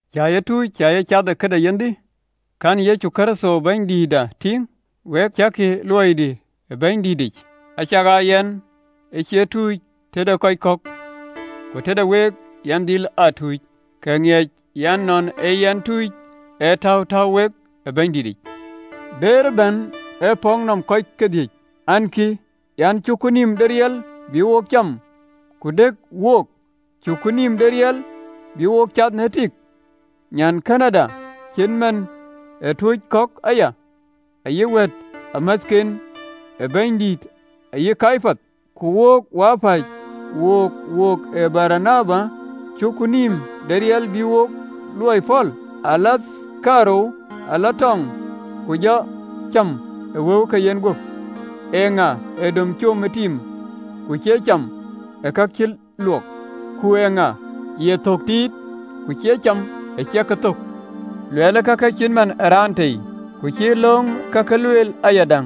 Cä ye tuc? Cä ye cath ë këde yenhdï? Kɛ̈n Yecu Kërtho Bɛ̈nydïïtda tïŋ? Week, cäkï ë luɔidï ë Bɛ̈nydïtic? Acakaa yɛn ë cie tuc tëde kɔc kɔ̈k, ku tëde week yɛn dhil aa tuc: kë ë ŋiëc yen nɔn a yɛn tuc ee täu täu wek ë Bɛ̈nydïtic. Bëër bän e pɔ̈k nɔm kɔc thiëc ɛn, kï an: Cuku nïïm de riɛl bï wok cam ku dëk wok? Cuku nïïm de riɛl bï wok cath në tik, nyankënëda, acït man ë tuuc kɔ̈k aya, ayï wɛ̈ɛ̈tamäthken ë Bɛ̈nydït, ayï Kepath? Ku wo wapäc, wook wokë Baranaba, cuku nïïm de riɛl bï wo luɔi pɔ̈l? Alathkërou ee lɔ tɔŋ, ku jɔ aa cam ë wëu ke yenguöp? Eeŋa ee dom com ë tiim, ku cie cam ë ka cï luɔk? Ku eeŋa ye thök tiit ku cie cam ë ciɛk ke thök? Luɛɛl kake cït man ë raan tei? Ku cïï löŋ kakë lueel ayadäŋ?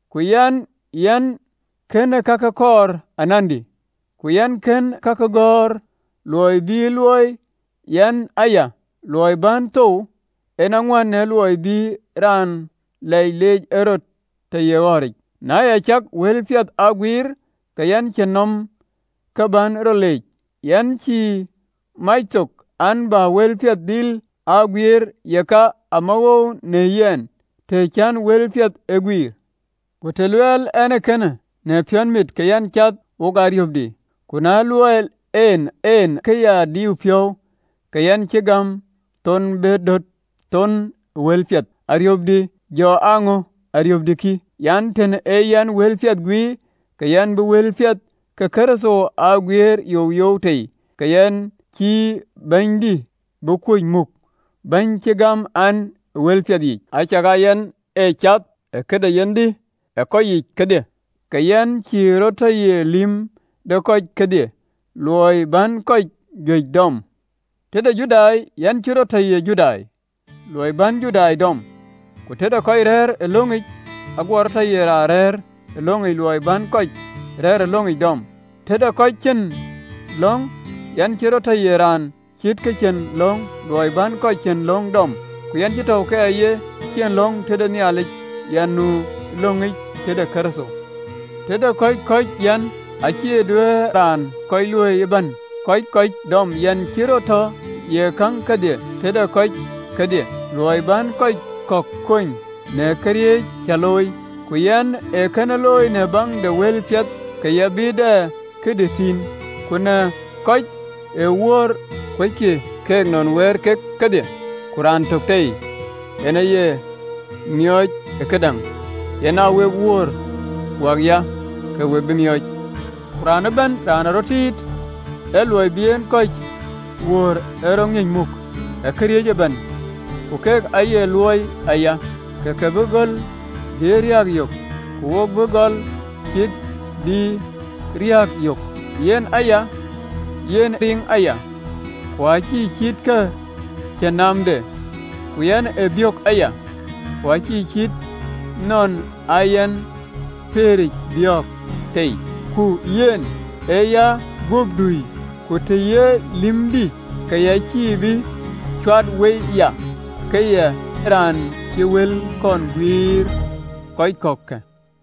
Ku yɛn, yɛn kɛ̈n kakë kɔɔr anandï: ku yɛn kën kakë gɔ̈ɔ̈r ë luɔi bï e luöi yɛn aya: luɔi bän thou en aŋuän në luɔi bï raan lɛc lɛɛc ɛn rɔt tɔ ye ɣɔ̈ric. Na ya cak wëlpiɛth aa guiir, ke yɛn cïn nɔm ke bän rɔt leec, yɛn cï mac thok, an, bä wëlpiɛth dhil aa guiir, yeka, amawoou në yɛn, të cän wëlpiɛth ee guiir. Ku të luɔɔi ɛn ee kënë në piɔ̈n mit, ke yɛn cath wo ariöpdï: ku të luɔɔi ɛn en ke ya diu piɔ̈u, ke yɛn cï gäm thön bä döt thön ë wëlpiɛth. Ariöpdï jɔ aa ŋö? Ariöpdï kï, an, “Tën aa yɛn wëlpiɛth guiir, ke yɛn bï wëlpiɛth ke Kërtho aa guiir youyou tei, ke yɛn cïï bɛ̈ɛ̈nydï bï kuöc muk, bɛ̈ɛ̈ny cï gäm ɛn ë wëlpiɛth yiic. Acakaa yɛn ë cath ë këde yenhdï ë kɔc yiic kedhie, ke yɛn cï rɔt tɔ ye lïm de kɔc kedhie, luɔi bän kɔc juëc dɔm. Tëde Judai yɛn cï rɔt tɔ ye Judai, luɔi bän Judai dɔm: ku tëde kɔc rɛ̈ɛ̈r ë löŋic, aguɔ rɔt tɔ ye raan rɛ̈ɛ̈r ë löŋic, luɔi bän kɔc rɛ̈ɛ̈r ë löŋic dɔm, tëde kɔc cïn löŋ, yɛn cï rɔt tɔ ye raan cït kë cïn löŋ, luɔi bän kɔc cïn löŋ dɔm, ku yɛn cïï tɔ̈u ke ya cïn löŋ tëde Nhialic, yɛn nu ë löŋic tëde Kërtho. Tëde kɔc kɔ̈c, yɛn ë cï ciët raan kɔ̈c, luɔi bän kɔc kɔ̈c dɔm: yɛn cï tɔ ye käŋ kedhie tëde kɔc kedhie, luɔi bän kɔc kɔ̈k kony në këriëëc cä looi. Ku yɛn ee kënë looi në baŋ de wëlpiɛth, ke yɛn bï dɛ këdï thïn. Ku na kɔc ë wöör, kuöckï keek nɔn wɛ̈ɛ̈r kek kedhie, ku raan tök en aye miɔɔc ë këdäŋ? Yen aa wek wöör wäkya, ke we bï miɔɔc. Ku raan ëbɛ̈n raan ee rɔt tiit ë luɔi bï en kɔc wöör, ee rɔt ŋiëc muk ë këriëëc ëbɛ̈n. Ku keek ayek luui aya ke ke bï göl bï riääk yök, ku wo bï göl cïï bï riääk yök. Yen aya yɛn riŋ aya, ku acïï cït ke cïn naamde, ku yɛn ee biök aya, ku acït nɔn aa yɛn pëëric biɔ̈ɔ̈k tei: ku yɛn ee yaguöp dui, ku ta ye lïmdï, ke ya cïï bï cuat wei, ya ka ye raan ë wël kɔn guiëër kɔc kɔ̈kkë.